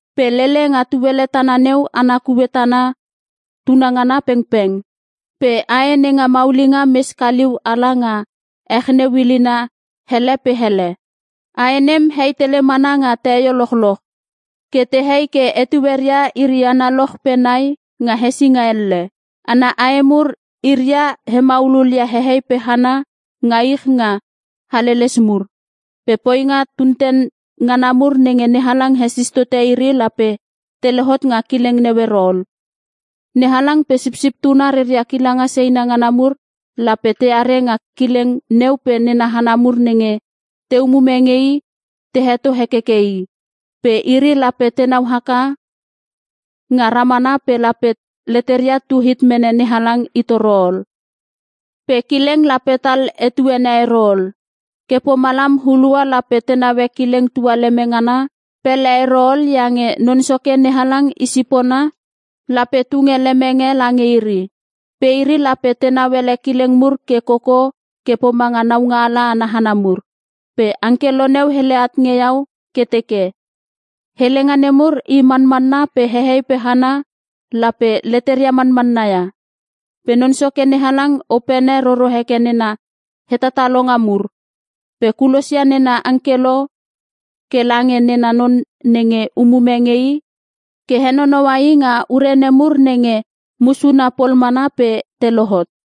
Pe lele nga tuele tana neu ana kue tana tunangana pengpeng. Pe ae nenga maulinga mes kaliu ala nga ech neu ilina ele pe ele. Ae nem hei tele mana nga teio lochloch. Ke tehei ke etueria iri analoch pe nai nga hesinga elle. Ana ae mur iria he maululia hehei pe hana nga ich nga haleles mur. Pe poinga tunten ngana mur nenge NeHalang hesis totote iri lape te lohot nga kileng neu ero ol. NeHalang pe Sipsip Tuna reria kilanga seina ngana mur lape teare nga kileng neu pe nena hana mur nenge te umume nge i te heto hekeke I. Pe iri lape tenau haka nga ramana pe lape leteria tu hit mene NeHalang itoro ol. Pe kileng lape tal etuene ero ol. Ke pomalam hulua lape te naue kileng tualeme ngana pele ero ol iange Non Soke NeHalang i sipona lape tunge lemenge lange iri. Pe iri lape tenau ele kileng mur ke koko ke pomange naungaala ana hana mur. Pe angkelo neu hele at nge iau ke teke, “Helenga nemur i manmanna pe hehei pe hana lape leteria manmanna ia. Pe Non Soke NeHalang opene roro heke nena hetatalonga mur. Pe kulosia nena angkelo ke lange nena non nenge umume nge I ke henonoua i nga ure nemur nenge musuna pol mana pe te lohot.”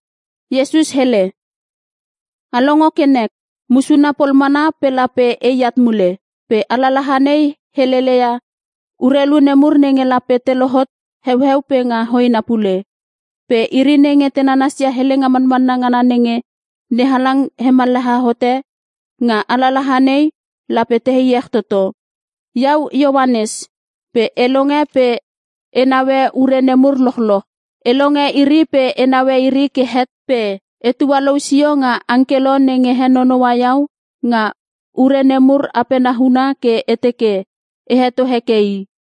Iesus hele, “A longo ke nek! Musuna pol mana pe lape eat mule! Pe alalaha nei helele ia urelu nemur nenge lape te lohot heueu pe nga hoena pule. Pe iri nenge te nanasia helenga manmanna ngana nenge NeHalang hemallaha hote nga alalaha nei lape te iech toto.” Iau Ioanes, pe e longe pe e naue ure nemur lochloch. E longe iri pe e naue iri ke het pe e tualou sio nga angkelo nenge henonoua iau nga ure nemur apena huna ke e teke e heto heke i.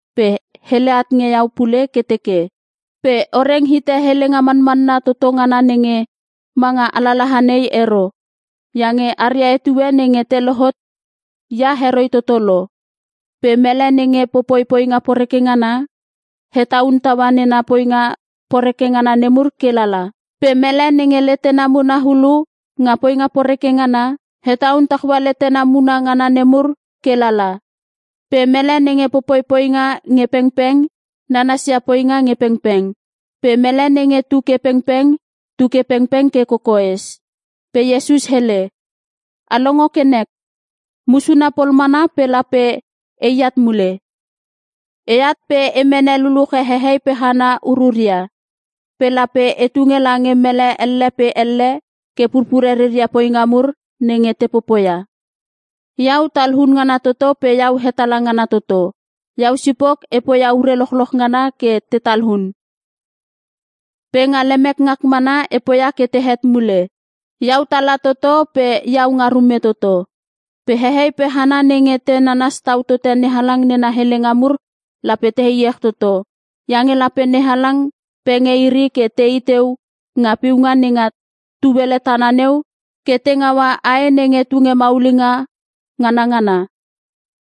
Pe hele at nge iau pule ke teke, “Pe o reng hite helenga manmanna toto ngana nenge manga alalaha nei ero. Iange aria etue nenge te lohot ia heroi toto lo. Pe mele nenge popoi poinga poreke ngana, hetaun taua nena poinga poreke ngana mur ke lala. Pe mele nenge letena muna ulu nga poinga poreke ngana, hetaun taua letena muna ngana nemur ke lala. Pe mele nenge popoi poinga nge pengpeng, nanasia poinga nge pengpeng. Pe mele nenge tuke pengpeng, tuke pengpeng ke kokoes.” Pe Iesus hele, “A longo ke nek! Musuna pol mana pe lape eat mule! Eat pe e mene luluche hehei pe hana ururia. Pe lape e tunge lange mele elle pe elle ke purpure reria poinga mur nenge te popoia. Iau Talun ngana Toto pe Iau Hetala ngana Toto. Iau sipok e poia ure lochloch ngana ke te talun, pe nga lemek ngak mana e poia ke tehet mule. Iau Tala toto pe Iau nga Rume toto. “Pe hehei pe hana nenge te nanas tau tote NeHalang nena helenga mur lape te iech toto. Iange lape NeHalang penge iri ke tei teu nga piunga nenga tuele tana neu ke te ngaua ae nenge tunge maulinga nganangana.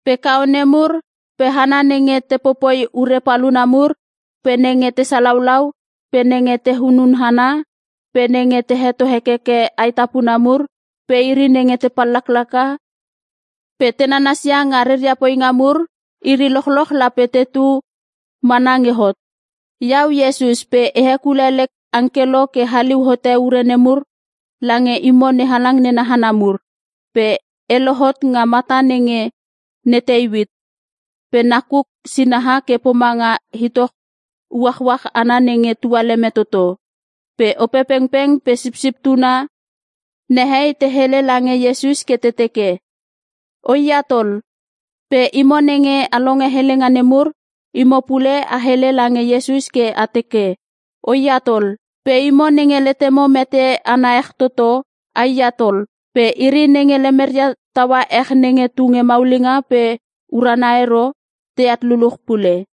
Pe kaone mur, pe hana nenge te popoi ure paluna mur, pe nenge te salaulau, pe nenge te hunun hana, pe nenge te heto hekeke aetapuna mur, pe iri nenge te pallaklaka, pe te nanasia nga reria poinga mur, iri lochloch lape tetu mana nge hot. “Iau Iesus pe e hekule lek angkelo ke haliu hote ure nemur lange imo NeHalang nena hana mur. Pe e lohot nga mata nenge ne Teuit pe nakuk sinaha ke pomanga itoch uachuach ana nenge tualeme toto.” Pe Opepengpeng pe Sipsip Tuna nehei te hele lange Iesus ke te teke, “O i at ol!” Pe imo nenge a longe helenga nei mur, imo pule a hele lange Iesus ke a teke, “O i at ol!” Pe imo nenge letemo meteana ech toto, ai at ol. Pe iri nenge lemeria taua ech nenge tunge maulinga pe uruna ero, teat luluch pule.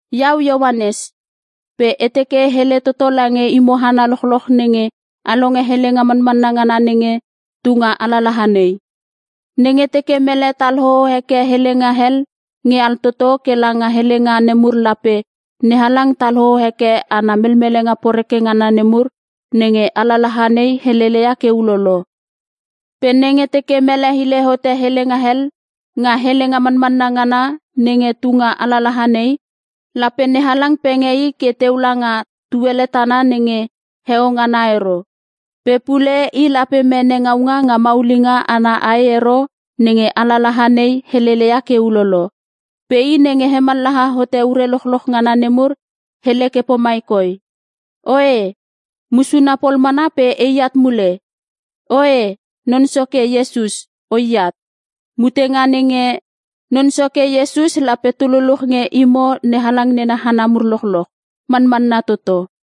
Iau Ioanes, pe e teke e hele toto lange imo hana lochloch nenge a longe helenga manmanna ngana nenge tunga alalaha nei. Nenge teke mele tal hoo heke helenga hel nge altoto ke langa helenga nemur lape NeHalang tal hoo heke ana melmelenga poreke ngana nemur nenge alalaha nei heleia ke ulolo. Pe nenge teke mele hile hote helenga hel nga helenga manmanna ngana nenge tunga alalaha nei, lape NeHalang penge i ke teu langa tuele tana nenge heo ngana ero. Pe pule i lape mene ngaunga nga maulinga ana ae ero nenge alalaha nei heleia ke ulolo. Pe I nenge hemallaha hote ure lochloch ngana nemur hele ke pomai koi, “Oe! Musuna pol mana pe eat mule! Oe, Non Soke Iesus O i at!” Mutenga nenge Non Soke Iesus lape tu luluch nge imo NeHalang nena hana mur lochloch. Manmanna Toto.